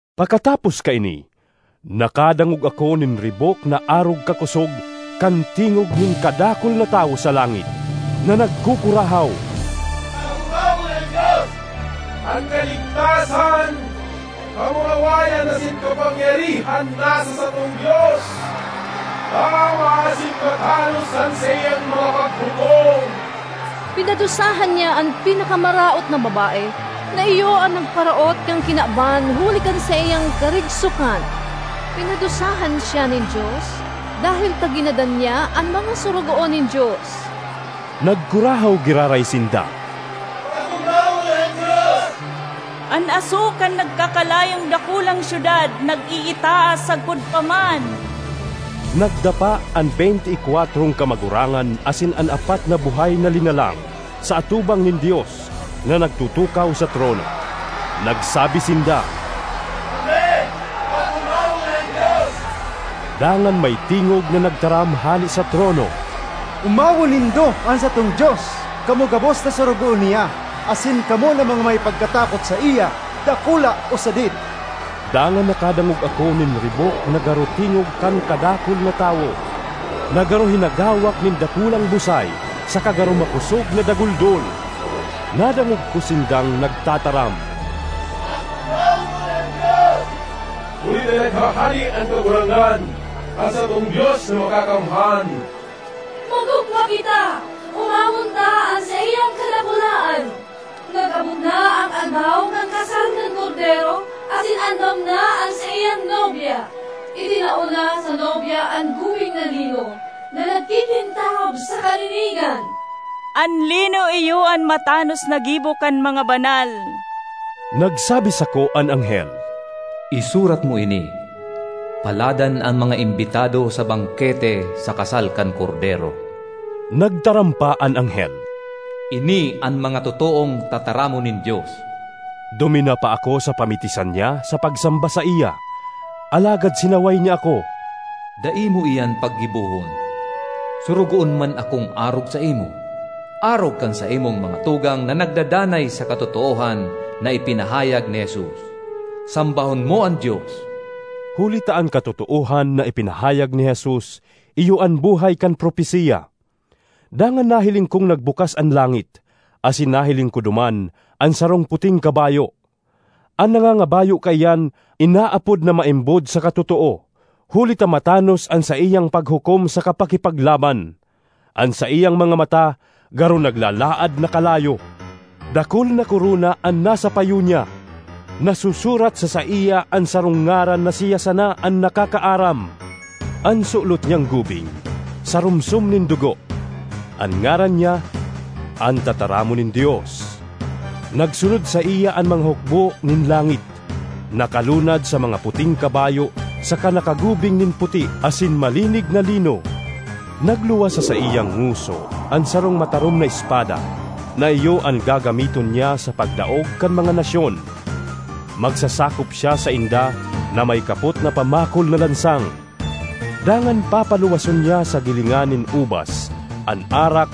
Pakatapos kaini, nakadangog ako nin ribok na arog kakosog kan tingog nin kadakul na tawo sa langit, na nagkukurahaw, “Pag-omawon an Dios! An kaligtasan, kamurawayan asin kapangyarihan nasa satong Dios! Tama asin matanos an saiyang mga paghukom! Pinadusahan niya an pinakamaraot na babae na iyo an nagparaot kan kinaban huli kan saiyang karigsokan. Pinadusahan siya nin Dios dahel ta ginadan niya an mga sorogoon nin Dios.” Nagkurahaw giraray sinda, “Pag-omawon an Dios! An aso kan nagkakalayong dakulang syudad nag-iitaas sagkod pa man!” Nagdapa an beynte y kwatrong kamagurangan asin an apat na buhay na linalang sa atubang nin Dios na nagtutukaw sa trono. Nagsabi sinda, “Amen! Pag-omawon an Dios!” Dangan may tingog na nagtaram hale sa trono, “Omawon nindo an satong Dios, kamo gabos na sorogoon niya asin kamo na mga may pagkatakot saiya, dakula o sadit!” Dangan nakadangog ako nin ribok na garo tingog kan kadakul na tawo, na garo hinagawak nin dakulang busay saka garo makosog na daguldol. Nadangog ko sindang nagtataram, “Pag-omawon an Dios, huli ta naghahade an Kagurangnan, an satong Dios na Makakamhan! Mag-ogma kita; omawon ta an saiyang kadakulaan! Nag-abot na an aldaw kan kasal kan Kordero asin andam na an saiyang nobya. Itinao na sa nobya an gubing na lino na nagkikintab sa kalinigan.” (An lino iyo an matanos na gibo kan mga banal.) Nagsabi sako an anghel, “Isurat mo ini: Paladan an mga imbitado sa bangkete sa kasal kan Kordero.” Nagtaram pa an anghel, “Ini an mga totoong tataramon nin Dios.” Duminapa ako sa pamitisan niya sa pagsamba saiya, alagad sinaway niya ako, “Dai mo iyan paggibohon! Sorogoon man akong arog saimo, arog kan saimong mga tugang na nagdadanay sa katotoohan na ipinahayag ni Jesus. Sambahon mo an Dios!” Huli ta an katotoohan na ipinahayag ni Jesus iyo an buhay kan propesiya. Dangan nahiling kong nagbukas an langit, asin nahiling ko duman an sarong puting kabayo. An nangangabayo kaiyan inaapod na Maimbod saka Totoo, huli ta matanos an saiyang paghukom saka pakipaglaban. An saiyang mga mata garo naglalaad na kalayo; dakul na korona an nasa payo niya. Nasusurat sa saiya an sarong ngaran na siya sana an nakakaaram. An sulot niyang gubing sarumsom nin dugo. An ngaran niya, “An Tataramon nin Dios.” Nagsunod saiya an mga hukbo nin langit, nakalunad sa mga puting kabayo saka nakagubing nin puti asin malinig na lino. Nagluwas sa saiyang ngoso an sarong matarom na espada na iyo an gagamiton niya sa pagdaog kan mga nasyon. Magsasakop siya sainda na may kapot na pamakol na lansang, dangan papaluwason niya sa gilingan nin ubas an arak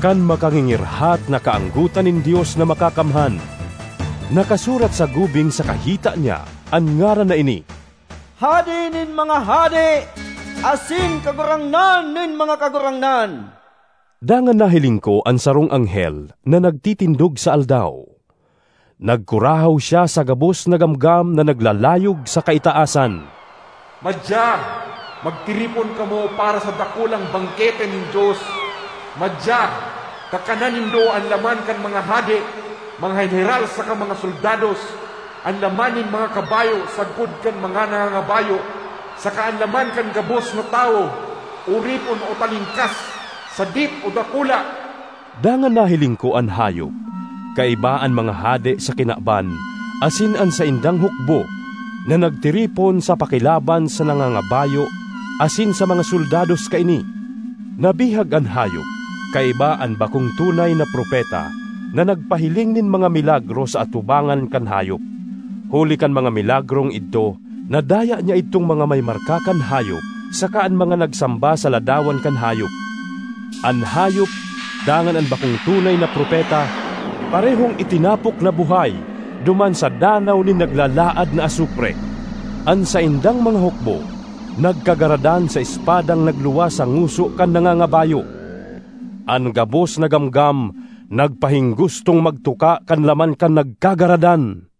kan makangingirhat na kaanggotan nin Dios na Makakamhan. Nakasurat sa gubing saka hita niya an ngaran na ini: “Hade nin mga hade asin Kagurangnan nin mga kagurangnan.” Dangan nahiling ko an sarong anghel na nagtitindog sa aldaw. Nagkurahaw siya sa gabos na gamgam na naglalayog sa kaitaasan, “Madya, magtiripon kamo para sa dakulang bangkete nin Dios! Madya, kakana nindo an laman kan mga hade, mga heneral saka mga soldados, an laman nin mga kabayo sagkod kan mga nangangabayo, saka an laman kan gabos na tawo, oripon o talingkas, sadit o dakula!” Dangan nahiling ko an hayop, kaiba an mga hade sa kinaban asin an saindang hukbo na nagtiripon sa pakilaban sa nangangabayo asin sa mga soldados kaini. Nabihag an hayop, kaiba an bakong tunay na propeta na nagpahiling nin mga milagro sa atubangan kan hayop. (Huli ka (kan) mga milagrong idto nadaya niya idtong mga may marka kan hayop saka an mga nagsamba sa ladawan kan hayop.) An hayop dangan an bakong tunay na propeta parehong itinapok na buhay duman sa danaw nin naglalaad na asupre. An saindang mga hukbo nagkagaradan sa espadang nagluwas sa ngoso kan nangangabayo; an gabos na gamgam nagpahinggustong magtuka kan laman kan nagkagaradan.